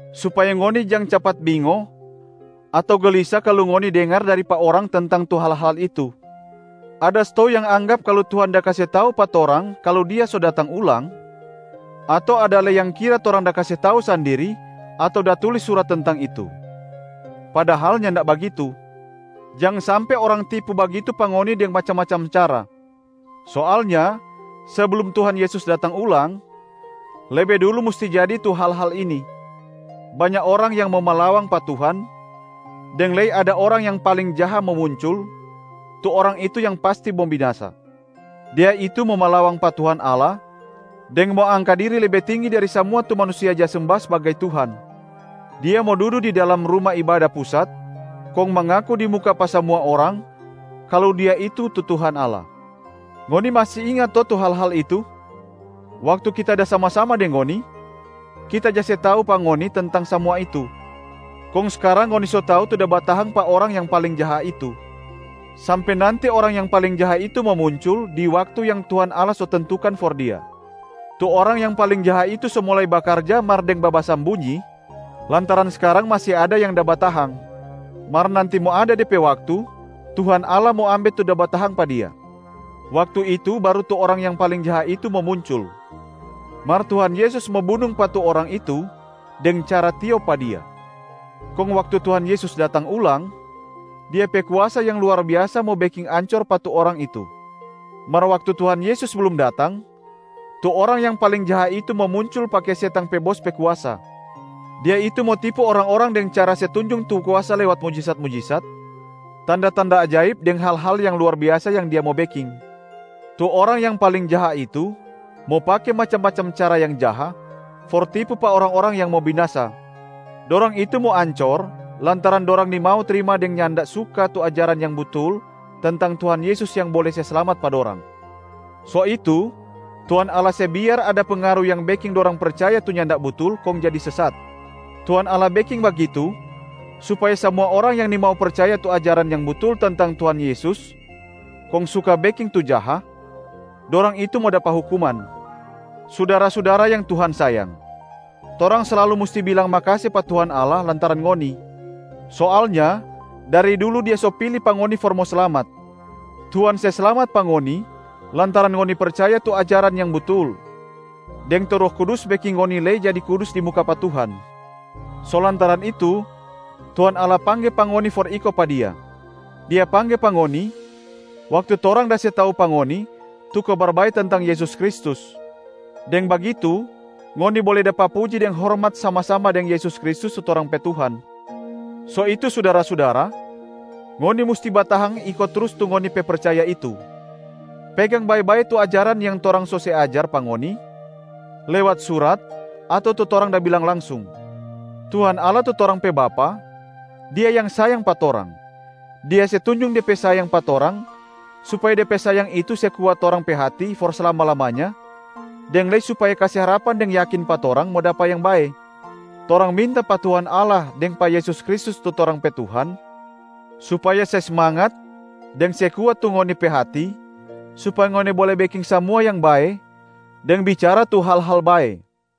supaya ngoni jang capat bingo ato gelisa kalu ngoni dengar dari pa orang tentang tu hal-hal itu. Ada stou yang anggap kalu Tuhan da kase tau pa torang kalu Dia so datang ulang, ato ada lei yang kira torang da kase tau sandiri ato da tulis surat tentang itu. Padahal nyanda bagitu. Jang sampe orang tipu bagitu pa ngoni deng macam-macam cara! Soalnya seblum Tuhan Yesus datang ulang, lebe dulu musti jadi tu hal-hal ini: banya orang yang mo malawang pa Tuhan, deng lei ada orang yang paling jaha mo muncul, tu orang itu yang pasti mo binasa. Dia itu mo malawang pa Tuhan Allah deng mo angka diri lebe tinggi dari samua tu manusia ja semba sbagai Tuhan. Dia mo dudu di dalam Ruma Ibada Pusat kong mangaku di muka pa samua orang kalu dia itu tu Tuhan Allah. Ngoni masi inga to tu hal-hal itu? Waktu kita da sama-sama deng ngoni, kita ja se tau pa ngoni tentang samua itu. Kong skarang ngoni so tau tu da batahang pa orang yang paling jaha itu, sampe nanti orang yang paling jaha itu mo muncul di waktu yang Tuhan Allah so tentukan for dia. Tu orang yang paling jaha itu so mulai bakarja mar deng babasambunyi lantaran skarang masi ada yang da batahang. Mar nanti mo ada de pe waktu Tuhan Allah mo ambe tu da batahang pa dia. Waktu itu baru tu orang yang paling jaha itu mo muncul. Mar Tuhan Yesus mo bunung pa tu orang itu deng cara tiop pa dia. Kong waktu Tuhan Yesus datang ulang, Dia pe kuasa yang luar biasa mo beking ancor pa tu orang itu. Mar waktu Tuhan Yesus blum datang, tu orang yang paling jaha itu mo muncul pake setang pe bos pe kuasa. Dia itu mo tipu orang-orang deng cara se tunjung tu kuasa lewat mujisat-mujisat, tanda-tanda ajaib deng hal-hal yang luar biasa yang dia mo beking. Tu orang yang paling jaha itu mo pake macam-macam cara yang jaha for tipu pa orang-orang yang mo binasa. Dorang itu mo ancor lantaran dorang nimau trima deng nyanda suka tu ajaran yang butul tentang Tuhan Yesus yang bole se slamat pa dorang. So itu Tuhan Allah se biar ada pengaru yang beking dorang percaya tu nyanda butul kong jadi sesat. Tuhan Allah beking bagitu supaya samua orang yang nimau percaya tu ajaran yang butul tentang Tuhan Yesus kong suka beking tu jaha, dorang itu mo dapa hukuman. Sudara-sudara yang Tuhan sayang! Torang slalu musti bilang makase pa Tuhan Allah lantaran ngoni. Soalnya dari dulu Dia so pili pa ngoni for mo slamat. Tuhan se slamat pa ngoni lantaran ngoni percaya tu ajaran yang butul, deng tu Roh Kudus beking ngoni lei jadi kudus di muka pa Tuhan. So lantaran itu, Tuhan Allah pangge pa ngoni for iko pa Dia. Dia pangge pa ngoni waktu torang da se tau pa ngoni tu Kabar Bae tentang Yesus Kristus. Deng bagitu ngoni bole dapa puji deng hormat sama-sama deng Yesus Kristus tu torang pe Tuhan. So itu sudara-sudara, ngoni musti batahang iko trus tu ngoni pe percaya itu! Pegang bae-bae tu ajaran yang torang so se ajar pa ngoni lewat surat ato tu torang da bilang langsung. Tuhan Allah, tu torang pe Bapa, Dia yang sayang pa torang. Dia se tunjung De pe sayang pa torang supaya De pe sayang itu se kuat torang pe hati for slama-lamanya deng lei supaya kase harapan deng yakin pa torang mo dapa yang bae. Torang minta pa Tuhan Allah deng pa Yesus Kristus tu torang pe Tuhan, supaya se smangat deng se kuat tu ngoni pe hati supaya ngoni bole beking samua yang bae deng bicara tu hal-hal bae.